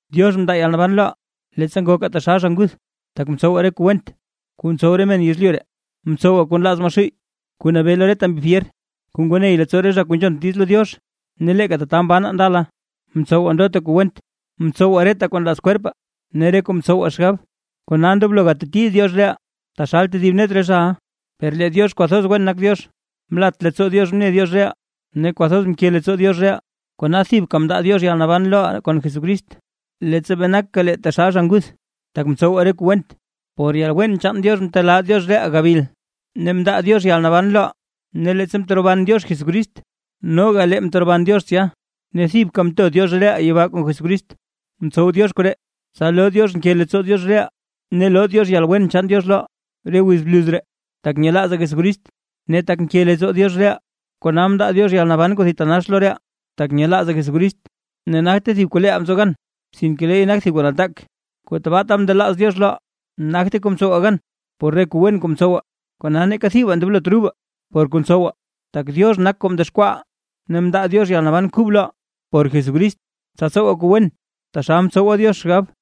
Diox mndaa yalnaban loʼaa, leettsa ngokaa taxal zha nguth, tak mtsowaa re kuu went, kuu ntsow re men yezlyu ree, mtsowaa kuu nlaaz Maxuuy kuu nabee lo reta mbi fyer, kuu ngoo ney leettsoo re zha kuu nzhont diiz lo Diox. Ne leeka tata mbanaa ndala, mtsowaa ndota kuu went, mtsowaa reta kuu nlaaz kwerpaa ne re kuu mtsowaa xgab. Kona ndoblo gateti Diox reʼaa, taxal tedib net re zhaʼa. Per lee Diox kwathoz wen nak Diox, mlat leettsoo Diox mne Diox reʼaa ne kwathoz nke leettsoo Diox reʼaa, kona thibka mndaa Diox yalnaban loʼaa kon Jesucrist, leettsa bee nakaa lee taxal zha nguth, tak mtsowaa re kuu went. Por yalwen chaan Diox mtelaa Diox reʼaa gabil ne mndaa Diox yalnaban loʼaa. Ne leettsa mteroban Diox Jesucrist noga lee mteroban Diox tsya, ne thibka mto Diox reʼaa yibaa kon Jesucrist. Mtsow Diox koree, tsa loo Diox nke leettsoo Diox reʼaa ne loo Diox yalwen chaan Diox loʼaa, re wiz bluz ree, tak nyelaazaa Jesucrist. Ne tak nke leettsoo Diox reʼaa, kona mndaa Diox yalnaban kuu thitanax loʼaa, tak nyelaazaa Jesucrist. Ne nagte thib kuu leeʼaa mtsow gan, sinke leey nak thib kuu nataak kuu tabaata mndelaaz Diox loʼaa. Nagte kuu mtsowaa gan por re kuu wen kuu ntsowaa, kona neeka thibaa ndoblot rubaa por kuu ntsowaa. Tak Diox nak kuu mdexkwaaʼaa, ne mndaa Diox yalnaban kub loʼaa por Jesucrist, tsa tsowaa kuu wen, taxal mtsowa Diox xgab.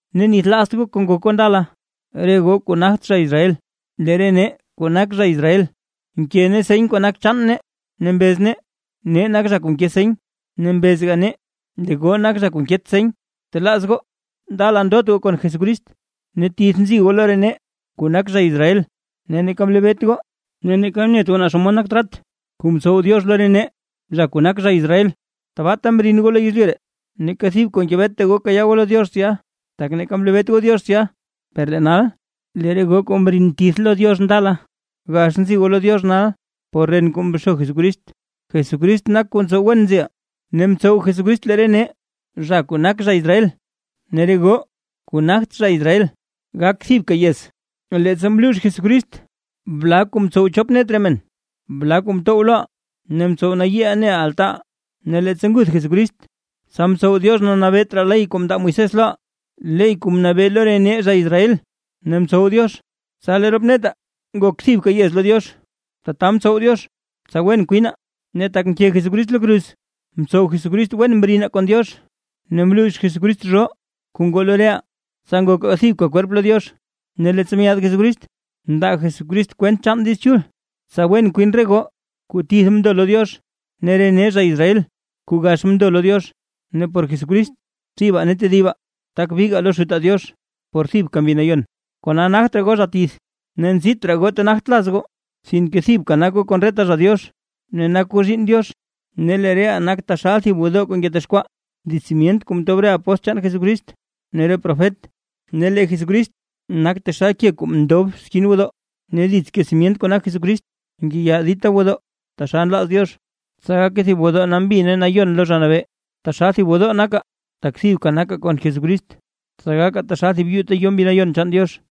Ne nithlaazt goo kuu ngok goo ndala, re goo kuu nagt zha Israel. Lee re nee zha kuu nak zha Israel nke nee seny kuu nak chaan nee ne mbez nee: “Nee nak zha kuu nke seny”, ne mbezga nee: “Lee goo nak zha kuu nket seny”. Btelaaz goo, ndala ndot goo kon Jesucrist ne tith nzi goo lo re nee kuu nak zha Israel, ne neeka mlebeet goo ne neeka mnet goo naa xomod nak trat kuu mtsow Diox lo re nee zha kuu nak zha Israel, tabaata mrin goo lo yezlyu ree, neeka thib kuu ngebeta goo kayaa goo lo Diox tsya, tak neeka mlebeet goo Diox tsya. Per lee nal, lee re goo kuu mrin tith lo Diox ndala, gax nzi goo lo Diox nal, por ren kuu mxo Jesucrist. Jesucrist nak kuu ntsow wen nziʼaa ne mtsow Jesucrist lee re nee zha kuu nak zha Israel ne re goo kuu nagt zha Israel, gak thibka yez, leettsa mluux Jesucrist bla kuu mtsow chop net re men, bla kuu mtow loʼaa ne mtsow nayiiʼaa neʼaa altaaʼaa. Ne leettsa nguth Jesucrist, tsa mtsow Diox nabeet raa ley kuu mndaa Diox lo Moisés loʼaa, ley kuu mnabee lo re nee zha Israel; ne mtsow Diox tsa lee rop netaa ngok thibka yez lo Diox, tata mtsow Diox tsa wen kwinaa. Ne tak mke Jesucrist lo kruz, mtsow Jesucrist wen mrinaa kon Diox ne mluux Jesucrist zhoo kuu ngoo lo reʼaa, tsa ngokaa thibka kwerp lo Diox. Ne leettsa myaad Jesucrist mndaa Jesucrist kwent chaan Diiz Chul, tsa wen kwin re goo kuu tith mndo lo Diox ne re nee zha Israel kuu gax mndo lo Diox. Ne por Jesucrist, thibaa ne tedibaa tak bigaa lo Xutaa Diox por thibka Mbi Nayon. Kona nagt raa goo zha tith, ne nzit raa goo ta nagt laz goo, sinke thibka nak goo kon reta zha Diox, ne nak goo zhiinn Diox. Ne lee reʼaa nak taxal thib gwodoo kuu ngetexkwaa, dits simyent kuu mtob re apóstl chaan Jesucrist ne re profet, ne lee Jesucrist nak taxal ke kuu ndob skin gwodoo. Ne dits ke simyent kuu nak Jesucrist, ngeya dita gwodoo taxal nlaaz Diox, tsa gake thib gwodoo nambi ne nayon lo Zha Nabee. Taxal thib gwodoo nakaa, tak thibka nakaa kon Jesucrist, tsa gakaa taxal thib yuu ta yo Mbi Nayon chaan Diox.